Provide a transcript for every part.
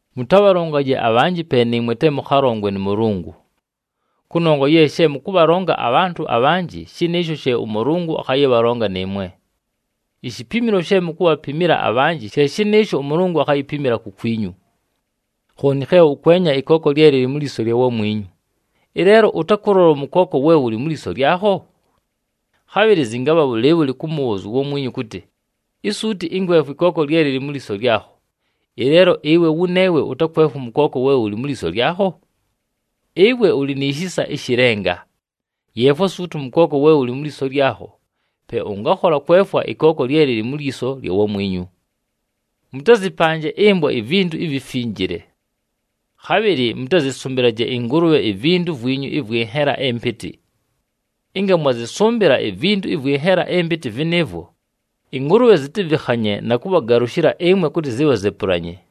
“Mʉtabhalongaje abhanjɨ pe nɨɨmwe te mʉkhalongwe nʉ Mʉlʉngʉ. Kʉnongwa ye she mʉkʉbhalonga abhantʉ abhanjɨ, shɨnɨɨsho she ʉMʉlʉngʉ akhayɨbhalonga nɨɨmwe. Ishipimilo she mukubhapimila abhanjɨ, she shɨnɨɨsho ʉMʉlʉngʉ akhayipimila kukwinyu. “Khooni khe ʉkwenya ɨkooko lye lɨlɨ mu lyiso lya wamwinyu, ɨleelo ʉtakʉlola ʉmʉkooko we wʉlɨ mu lyiso lyakho? Khabhɨlɨ zɨngabha bhʉlɨɨbhʉlɨ kʉmʉbhʉʉzya uwamwinyu kʉtɨ, ‘Isuuti ɨnkwefwe ɨkooko lye lɨlɨ mu lyiso lyakho,’ ɨleelo ɨwe wʉneewe ʉtakwefwa ʉmʉkooko we wʉlɨ mu lyiso lyakho? Ɨwe ʉlɨ ni shisa ɨshɨ lenga! Yeefwa suuti ʉmʉkooko we wʉlɨ mu lyiso lyakho, pe ʉngakhola kwefwa ɨkooko lye lɨlɨ mu lyiso lya wamwinyu! “Mʉtazɨpanje ɨmbwa ivintu ivifinjile. Khabhɨlɨ mʉtazɨsʉmbɨlaje ɨngʉlʉbhe ivintu vwinyu ɨvwɨ nhela ɨmpɨtɨ. Ɨnga mwazɨsʉmbɨla ivintu ɨvwɨ nhela ɨmpɨtɨ vɨnɨɨvwo, ɨngʉlʉbhe zɨtakhavɨkhanye na kʉbhagalʉshɨla ɨmwe kʉtɨ zibhazepulanye.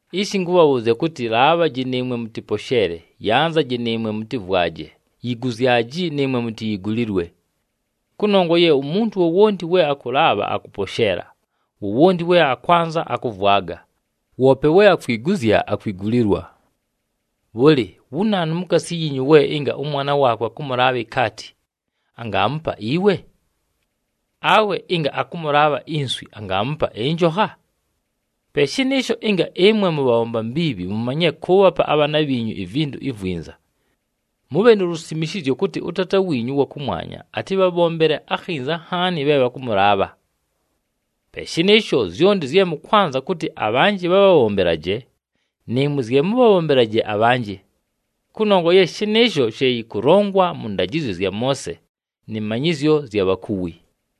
“Ishi ɨnkʉbhabhʉʉzya kʉtɨ, laabhaji nɨɨmwe mʉtɨposheele, yanzaji nɨɨmwe mʉtɨvwaje, yiguzyaji nɨɨmwe mutiyigulilwe. Kʉnongwa ye umuntu wowonti we akʉlaabha, akʉposheela, wowonti we akwanza, akʉvwaga, woope we akwiguzya, akwigulilwa. “Bhʉlɨ, wu naanu mukaasi yiinyu we ɨnga ʉmwana waakwe akʉmʉlaabha ikaati, angaamupa iwe? Awe ɨnga akʉmʉlaabha inswi, angaamupa ɨnjokha? Pe shɨnɨɨsho, ɨnga ɨmwe mʉbhabhomba mbiibhi mumanyile kʉʉbhapa abhaana bhiinyu ivintu ivwinza, mʉbhe nu lusimishizyo kʉtɨ ʉTaata wiinyu ʉwa kʉmwanya atɨbhabhombele akhinza nhaani, bhe bhakʉmʉlaabha. “Pe shɨnɨɨsho, zyonti zye mʉkwanza kʉtɨ abhanjɨ bhabhabhombelaje, nɨɨmwe zye mʉbhabhombelaje abhanjɨ. Kʉnongwa ye shɨnɨɨsho she yɨkʉlongwa mʉ ndajɨzyo zya Moose nɨ manyɨzyo zya bhakuwi.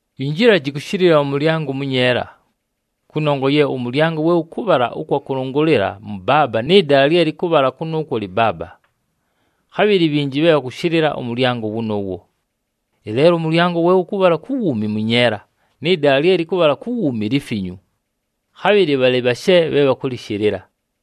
“Yinjilaji kʉshɨlɨla pa mʉlyango ʉmʉnyeela. Kʉnongwa ye ʉmʉlyango we wʉkʉbhala ʉkwa kʉlʉngʉlɨla mʉbaaba nɨ dala lye lɨkʉbhala kʉnʉʉkwo lɨbaaba. Khabhɨlɨ bhinji bhe bhakʉshɨlɨla ʉmʉlyango wʉnʉʉwo. Ɨleelo ʉmʉlyango we wʉkʉbhala ku wuumi mʉnyeela, nɨ dala lye lɨkʉbhala ku wuumi lifinyu. Khabhɨlɨ bhalɨ bhashe bhe bhakʉlɨshɨlɨla.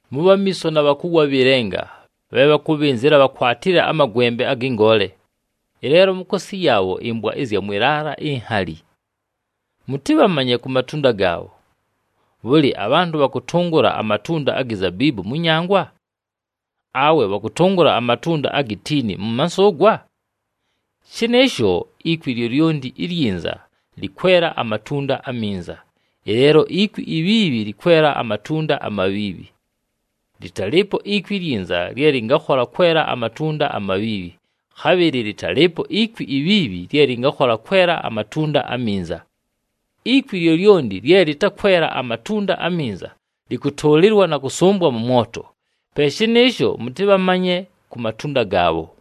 “Mʉbhe amiiso na bhakuwi abhɨ lenga, bhe bhakʉbhɨnzɨla, bhakwatile amagwembe agɨ ngoole. Ɨleelo mukaasi yaabho ɨmbwa zya mwɨ laala inhali. Mʉtɨbhamanye ku matunda gaabho. Bhʉlɨ, abhantʉ bhakʉtʉngʉla amatunda agi zabiibu mʉ nyangwa? Awe bhakʉtʉngʉla amatunda agi tiini mʉ mansʉʉgwa? Shɨnɨɨsho, ikwi lyolyonti ilyinza lɨkwela amatunda aminza, ɨleelo ikwi ibhiibhi lɨkwela amatunda amabhiibhi. Lɨtalɨɨpo ikwi ilyinza lye lɨngakhola kwela amatunda amabhiibhi, khabhɨlɨ lɨtalɨɨpo ikwi ibhiibhi lye lɨngakhola kwela amatunda aminza. Ikwi lyolyonti lye lɨtakwela amatunda aminza, lɨkʉtʉʉlɨlwa na kʉsʉmbwa mʉ mwoto. Pe shɨnɨɨsho mʉtɨbhamanye ku matunda gaabho.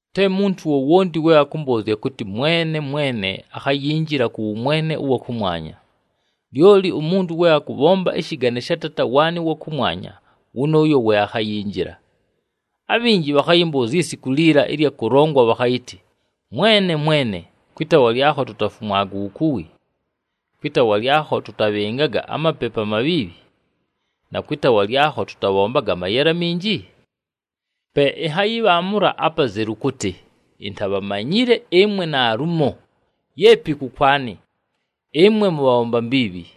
“Te muntu wowonti we akʉmbʉʉzya kʉtɨ, ‘Mwene, Mwene,’ akhayinjila kʉ wʉmwene ʉwa kʉmwanya. Lyoli umuntu we akʉbhomba ɨshɨgane sha Taata waanɨ ʉwa kʉmwanya, wʉnʉʉyo we akhayinjila. Abhinji bhakhayɨmbʉʉzya isiku liila ɨlya kʉlongwa bhakhayɨtɨ, ‘Mwene, Mwene! Kwɨ taawa lyakho tutafumwaga uwukuwi, kwɨ taawa lyakho tʉtabhɨngaga amapepu amabhiibhi, na kwɨ taawa lyakho tʉtabhombaga amayele aminji?’ Pe ɨnhayɨbhaamʉla apazelu kʉtɨ, ‘Intábhamanyile ɨmwe naalumo! Yeepi kʉkwanɨ, ɨmwe mʉbhabhomba mbiibhi!’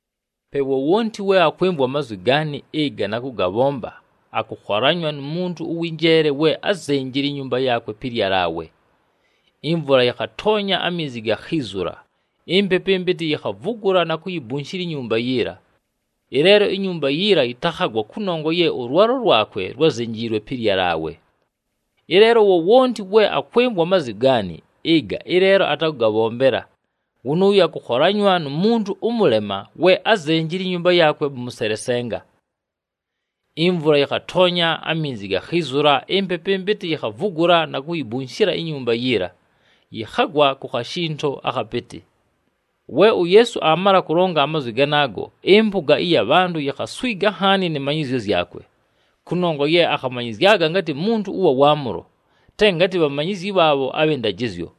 “Pe wowonti we akwɨmvwa amazwi gaanɨ ɨga na kʉgabhomba, akʉkholanywa nu muntu ʉwɨ njeele we ázenjile inyumba yaakwe pɨ lyalaawe. Imvula yɨkhatoonya, aminzi gakhiizula, impepu ɨmpɨtɨ yikhavugula na kuyibunshila inyumba yiila. Ɨleelo inyumba yiila yɨtakhagwa kʉnongwa ye ʉlwalo lwakwe lwázenjiilwe pɨ lyalaawe. Ɨleelo wowonti we akwɨmvwa amazwi gaanɨ ɨga, ɨleelo atakʉgabhombela, wʉnʉʉyo akʉkholanywa nu muntu ʉmʉlema we ázenjile inyumba yaakwe pa mʉselesenga. Imvula yɨkhatoonya, aminzi gakhiizula, impepu ɨmpɨtɨ yikhavugula na kuyibunshila inyumba yiila, yɨkhagwa ku khashinto akhapɨtɨ!” We uYeesu aamala kʉlonga amazwi ganaago, ɨmpʉga ɨya bhantʉ yikhaswiga nhaani nɨ manyɨzyo zyakwe, kʉnongwa ye akhamanyɨzyaga ngatɨ muntu ʉwa waamʉlo, te ngatɨ bhamanyizyi bhaabho abhɨ ndajɨzyo.